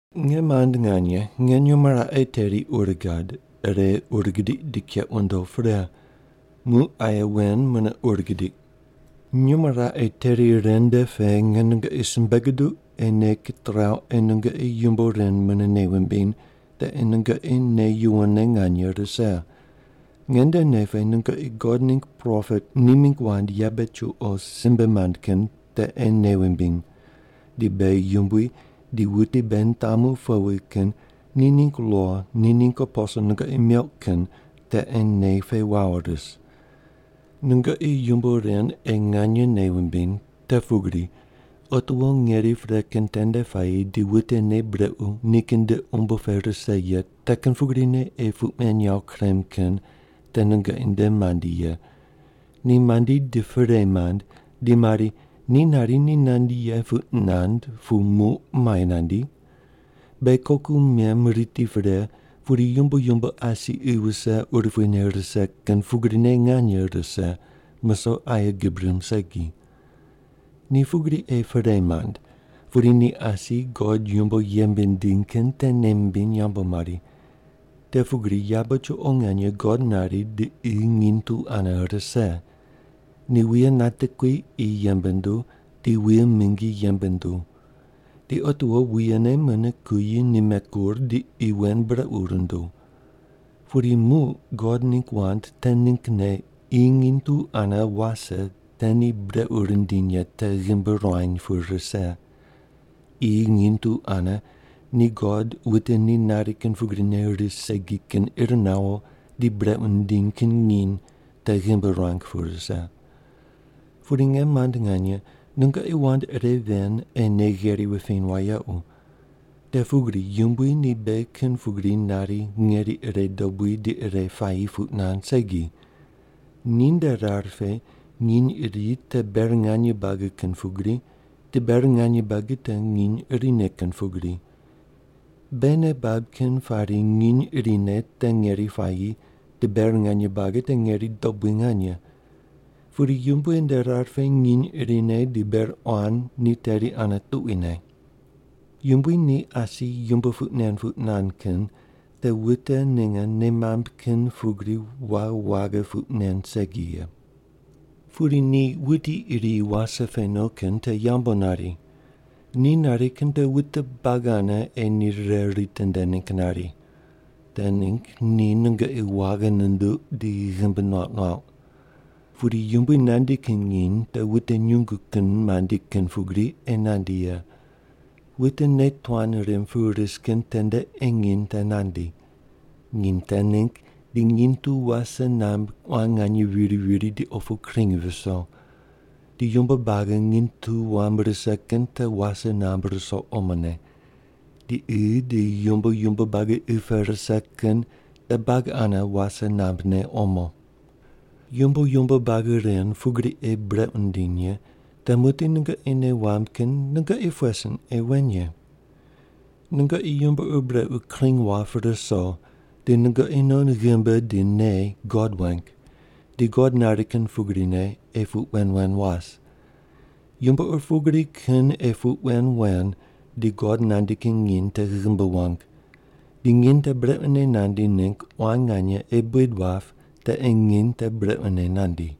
Nge mand nganye, nge nyumo raqe teri ur gad, ire ur gidiq di keq wundo pre. Muq aye wen mune ur gidiq. Nyumo raqe teri ren nde pe nge nungoqi simbe guduq ei nei kitrauq ei nungoqi yumbo ren mune nei wumbiny te ei nungoqi nei yuwonne nganye rise. Nge nde nei pe nungoqi God ningg propet ni mingg wand yabe chuqo simbe mand kin te ei nei wumbiny. Di beghi Yumbui di wuti beghi nitamu powi kin ni ningg lo ni ningg aposel nungoqi meuq kin te ei nei pe wawo ris. Di nungoqi yumbo ren ei nganye nei wumbiny, te pugri: Otiwo ngeri pre kin tende puayi di wute nei brequ nikin nde umbo pe rise ye te kin pugrine ei puq men yawo kurem kin te nungoqi nde mandi ye. Ni mandi di perei mand di mari, “Ni nari ni nandi ye puq nand pu muq muai nandi? Beghi koku mem riti pre pudi yumbo yumbo asi qi wuse urupui ne rise kin pugrine nganye rise, musoq aye gib rimb segi.” Ni pugri ei perei mand, pudi ni asi God yumbo yembe nindiny kin te nei mimbiny yambu mari. Te pugri yabe chuqo nganye God nari di qi nginy tu ane rise. Ni wuye natekui qi yembe nunduw, di wuye mingi yembe nunduw. Di otiwo wuyene mune kuyi nime kur di qi wen brequ runduw. Pudi muq God ningg wand te ninggne qi nginy tu ane wase te ni brequ rindiny ye te ghimbi ruany pu rise. Qi nginy tu ane ni God wute ni nari kin pugrine ris segi kin ir nawo di brequ nindiny kin nginy te ghimbi ruang pu rise. Pudi, nge mand nganye, nungoqi wand ire ven ei nei gheri wupiny wayequ. Te pugri Yumbui ni beghi kin pugri nari ngeri ire dobui di ire puayi puq nand segi. Ninde rar pe nginy iri te ber nganye buagi kin pugri, di ber nganye buagi te nginy irine kin pugri. Beghi nei bab kin pari nginy irine te ngeri puayi di ber nganye buagi te ngeri dobui nganye, pudi Yumbui nde rar pe nginy irine di ber quan ni teri ane tuquine. Yumbui ni asi yumbo puq nen puq nand kin te wute ninge nei mamb kin pugri waghi waghi puq nen segi ye. Pudi ni wuti iri wase pe no kin te yambu nari. Ni nari kin te wute buagi ane ei nei rire ritinde ningg nari. Te ningg ni nungoqi waghi nunduq di ghimbi nuauq nuauq. Pudi Yumbui nandi kin nginy te wute nyungu kin mandi kin pugri ei nandi ye. Wute nei tuan rimb pu ris kin tende ei nginy te nandi. Nginy te ningg di nginy tu wase namb quan nganye viri viri di opu kring viso. Di yumbo buagi nginy tu wam rise kin te wase namb ruso omone. Di qi di yumbo yumbo buagi qi pe rise kin te buagi ane wase nambne omo. Yumbo yumbo buagi ren pugri ei brequ nindiny ye, te muqdi nungoqi nei wamb kin nungoqi pughe sin ei wen ye? Nungoqi yumbo ur brequ kring wap ruso, di nungoqi non ghimbi di nei God weng di God nari kin pugrine ei puq wen wen was. Yumbo ur pugri kin ei puq wen wen di God nandi kin nginy te ghimbi wang, di nginy te brequne nandi ningg quan nganye ei buid wap te ei nginy te brequne nandi.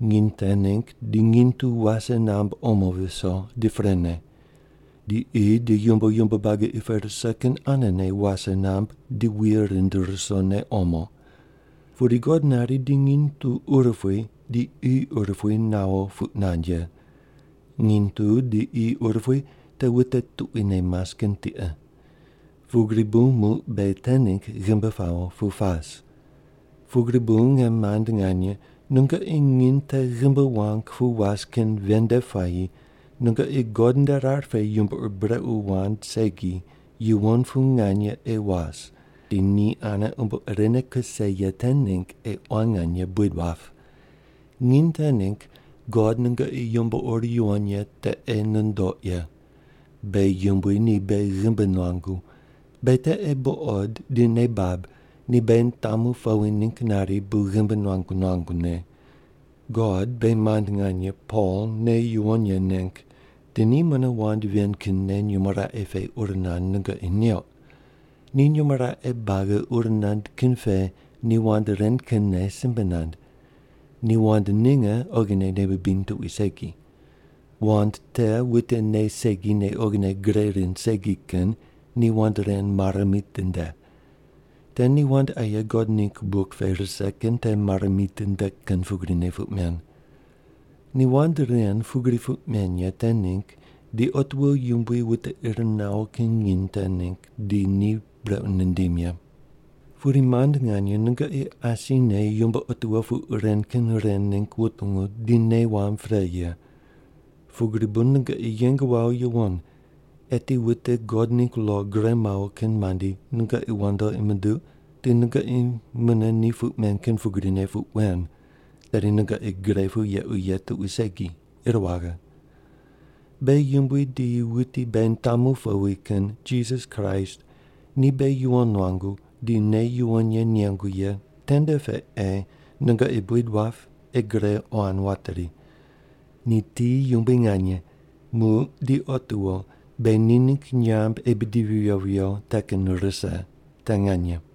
Nginy te ningg di nginy tu wase namb omo viso di prene, di qi di yumbo yumbo buagi qi pe rise kin anene wase namb di wuye rind rusone omo. Pudi God nari ni nginy tu urupui di qi urupui nawo puq nand ye. Nginy tu di qi urupui te wute tuquine mas kin tiqe. Pugri bu muq beghi te ningg ghimbi pawo pu pas. Pugri bu nge mand nganye, nungoqi nginy te ghimbi wang pu was kin ven nde puayi nungoqi God nde rar pe yumbo ur brequ wand segi yuwon pu nganye ei was, di ni ane umbo irene kuse ye te ningg ei quan nganye buid wap. Nginy te ningg God nungoqi yumbo ur yuwon ye te ei nundoq ye. Beghi Yumbui ni beghi ghimbi nuangu. Beghi te ei buqod di nei bab ni beghi nitamu powi ningg nari bu ghimbi nuangu nuangune. God beghi mand nganye Pol nei yuwon ye neng, di ni mune wand ven kinne nyumo raqe pe ur nand nungoqi neuq. Ni nyumo raqe buagi ur nand kin pe ni wand ren kinne simbe nand. Ni wand ninge oghine nei bibiny tuqui segi. Wand te wute nei segi nei oghine gre rind segi kin ni wand ren mare mitinde. Te ni wand aye God ningg buk pe rise kin te mare mitinde kin pugrine puq men. Ni wand ren pugri puq meny ye te ningg di otiwo Yumbui wute ir nawo ye nginy te ningg di ni brequ nindim ye. Pudi mand nganye, nungoqi asine yumbo otiwo puq ren kin ren ningg wutungu di nei wamb pre ye. Pugri bu nungoqi yeng wawo yuwon, eti wute God ningg lo gure mawo kin mandi nungoqi wandoqi munduq di nungoqi mune ni puq men kin pugrine puq wen, tedi nungoqi gre pu yequ ye tuqui segi, ir waghe. Beghi yumbui di wuti beghi nitamu powi kin Jisas Kraist ni beghi yuwon nuangu di nei yuwon ye nengu ye tende pe ei nungoqi buid wap ei gre quan wateri. Ni ti yumbui nganye, muq di otiwo beghi ni ningg nyamb ei bidivi viyo viyo te kin rise. Te nganye.